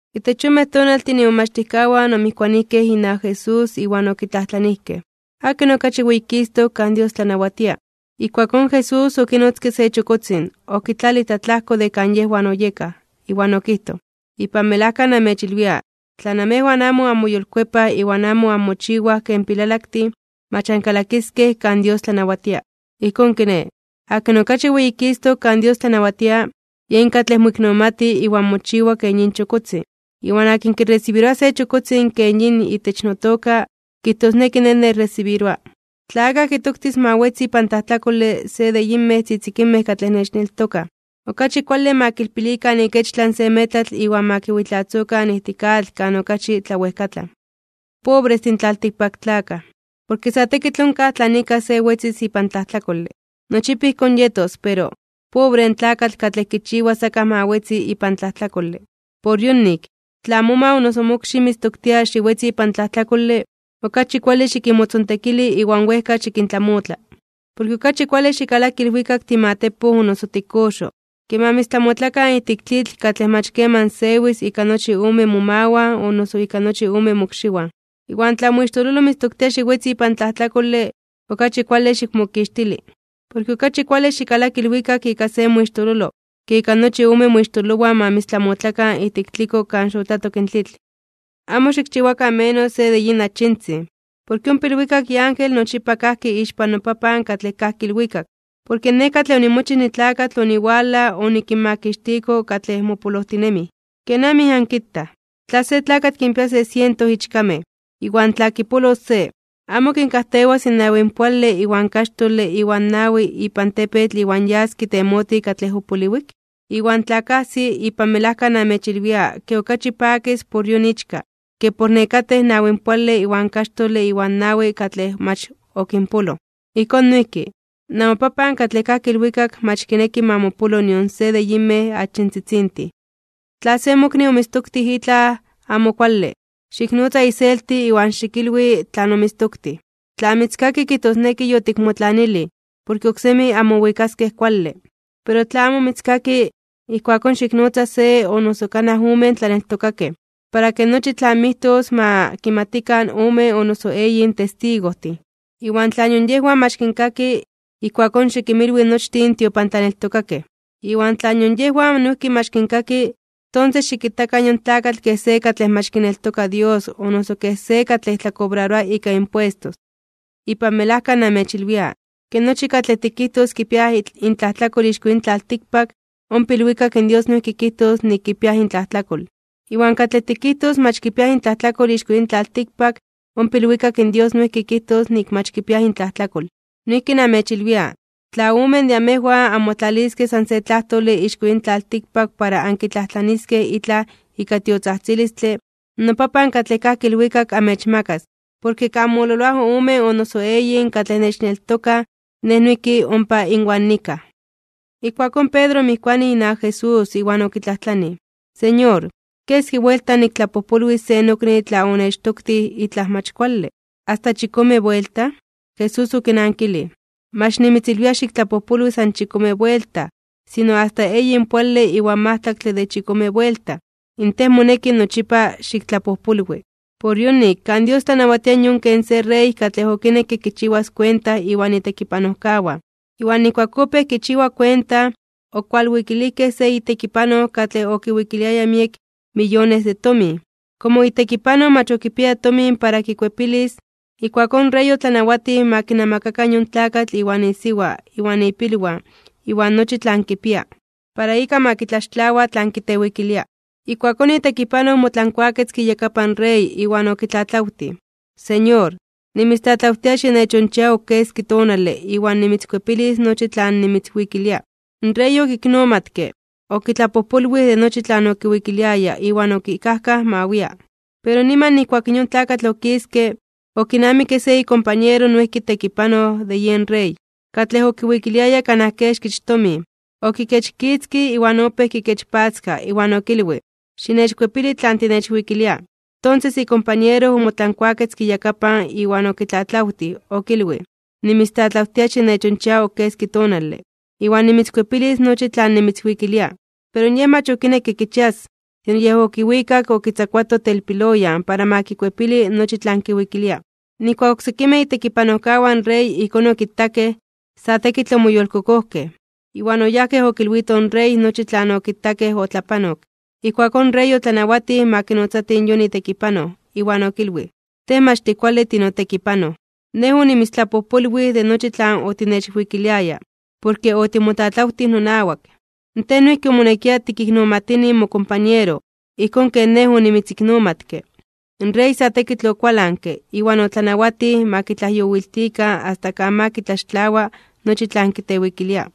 Itech yonmej tonaltin imomachtijkawan omijkuanijkej inawak Jesús iwan okitlajtlanijkej: ―¿Akin okachi weyikistok (weyititok) kan Dios tlanawatia? Ijkuakón Jesús okinotzke se chokotzin, okitlalij tlatlajko de kan yejwan oyekaj, iwan okijtoj: ―Ipan melajka namechilwia, tla namejwan amo anmoyolkuepaj iwan amo anmochiwaj ken pilalaktin, mach ankalakiskej kan Dios tlanawatia. Ijkón kiné, akin okachi weyikistok (weyititok) kan Dios tlanawatia, yen katlej moiknomati iwan mochiwa ken yin chokotzin. Iwan akin kiresibiroa se chokotzin ken yin itech notoka, kijtosneki Nej nechresibiroa. ’Tla akaj kitoktis ma wetzi ipan tlajtlakole se de yinmej tzitzikinmej katlej nechneltokaj, okachi kuale ma kilpilikan ikechtlan se metlatl iwan ma kiwitlazokan ijtik atl kan okachi tlawejkatlan. ¡Pobrestin tlaltikpaktlakaj! Porke sa tekitl onkaj tlan ika se wetzis ipan tlajtlakole. Nochipa ijkón yetos, pero ¡pobre in tlakatl katlej kitoktis akaj oksé ma wetzi ipan tlajtlakole! ’Por yonik, tla moma o noso mokxi mitztoktia xiwetzi ipan tlajtlakole, okachi kuale xikinmotzontekili iwan wejka xikintlamotla. Porke okachi kuale xikalaki ilwikak timatepoj o noso tikoxo, ke ma mitztlamotlakan ijtik tlitl katlej mach keman sewis ika nochi ome momawan o noso ika nochi ome mokxiwan. Iwan tla moixtololo mitztoktia xiwetzi ipan tlajtlakole, okachi kuale xikmokixtili. Porke okachi kuale xikalaki ilwikak ika se moixtololo, ke ika nochi ome moixtololowan ma mitztlamotlakan ijtik tliko kan xotlatok in tlitl. ’Amo xikchiwakan menos se de yin achintzin. Porke ompa ilwikak iángel nochipa kajki ixpan noPapan katlej kajki ilwikak. Porke Nej katlej onimochij nitlakatl oniwalaj onikinmakixtiko katlej mopolojtinemij. ’¿Kenamij ankitaj? Tla se tlakatl kinpia se siento ichkamej, iwan tla kipolos se, ¿amo kinkajtewas in nawinpoale iwan kaxtole iwan nawi ipan tepetl iwan yas kitemotij katlej opoliwik? Iwan tla kajsi, ipan melajka namechilwia ke okachi pakis por yon ichka, ke por nekatej in nawinpoale iwan kaxtole iwan nawi katlej mach okinpoloj. Ijkón noijki, namoPapan katlej kajki ilwikak mach kineki ma mopolo nion se de yinmej achintzitzintin. ’Tla se mokni omitztoktij itlaj amo kuale, xiknotza iselti iwan xikilwi tlan omitztoktij. Tla mitzkaki, kijtosneki yotikmotlanilij, porke oksemi anmowikaskej kuale. Pero tla amo mitzkaki, ijkuakón xiknotza se o kanaj omen tlaneltokakej, para ke nochi tlan mijtos ma kimatikan omen o noso eyin testigojtin. Iwan tla nion yejwan mach kinkaki, ijkuakón xikinmilwi nochtin in tiopantlaneltokakej. Iwan tla nion yejwan noijki mach kinkaki, tonses xikitakan yon tlakatl kej se katlej mach kineltoka Dios o noso kej se katlej tlakobraroa ika impuestos. ’Ipan melajka namechilwia, ke nochi katlej tikijtos kipiaj intlajtlakol ixko yin tlaltikpak, ompa ilwikak in Dios noijki kijtos nik kipiaj intlajtlakol. Iwan katlej tikijtos mach kipiaj intlajtlakol ixko yin tlaltikpak, ompa ilwikak in Dios noijki kijtos nik mach kipiaj intlajtlakol. ’Noijki namechilwia, tla omen de amejwan anmotlaliskej san se tlajtole ixko yin tlaltikpak para ankitlajtlaniskej itlaj ika tiotzajtzilistle, noPapan katlej kajki ilwikak amechmakas. Porke kan mololoaj omen o noso eyin katlej nechneltokaj, Nej noijki ompa inwan nikaj. Ijkuakón Pedro omijkuanij inawak Jesús iwan okitlajtlanij: ―Señor, ¿keski buelta niktlapojpolwis se nokni tla onechtoktij itlaj mach kuale? ¿Asta chikome buelta? Jesús okinankilij: ―Mach nimitzilwia xiktlapojpolwi san chikome buelta, sino asta eyinpoale iwan majtlaktle de chikome buelta, in tej moneki nochipa xiktlapojpolwi. ’Por yonik, kan Dios tlanawatia yon ken se rey katlej okinekke kichiwas kuenta iwan itekipanojkawan. Iwan nijkuak opéj kichiwa kuenta, okualwikilijkej se itekipanoj katlej okiwikiliaya miek miyones de tomin. Komo itekipanoj mach okipiaya tomin para kikuepilis, ijkuakón in rey otlanawatij ma kinamakakan yon tlakatl iwan isiwa, iwan ipilwan, iwan nochi tlan kipia, para ika ma kitlaxtlawa tlan kitewikilia. Ijkuakón itekipanoj omotlankuaketzke iyakapan rey iwan okitlatlawtij: “Señor, nimitztlatlawtia xinechonchia ok keski tonale iwan nimitzkuepilis nochi tlan nimitzwikilia.” In rey okiknomatke, okitlapojpolwij de nochi tlan okiwikiliaya iwan okikajkaj ma wia. Pero niman nijkuak in yon tlakatl okiske, okinamikke se ikompañero noijki tekipanoj de yen rey, katlej okiwikiliaya kanaj kexkich tomin. Okikechkitzkij iwan opéj kikechpatzka, iwan okilwij: “¡Xinechkuepili tlan tinechwikilia!” Tonses ikompañero omotlankuaketzke iyakapan iwan okitlatlawtij, okilwij: “Nimitztlatlawtia xinechonchia ok keski tonale, iwan nimitzkuepilis nochi tlan nimitzwikilia.” Pero yej mach okinekke kichias, sino yej okiwikak okitzakuato telpiloyan para ma kikuepili nochi tlan kiwikilia. Nijkuak oksekimej itekipanojkawan in rey ijkón okitakej, sa tekitl omoyolkokojkej. Iwan oyajkej okilwitoj in rey nochi tlan okitakej otlapanok. Ijkuakón in rey otlanawatij ma kinotzatij yon itekipanoj, iwan okilwij: “Tej mach tikuale tinotekipanoj. Nej onimitztlapojpolwij de nochi tlan otinechwikiliaya, porke otimotlatlawtij nonawak. Tej noijki omonekia tikiknomatini mokompañero, ijkón ken nej onimitziknomatke.” In rey sa tekitl okualanke, iwan otlanawatij ma kitlajyowiltikan asta kan ma kitlaxtlawa nochi tlan kitewikilia.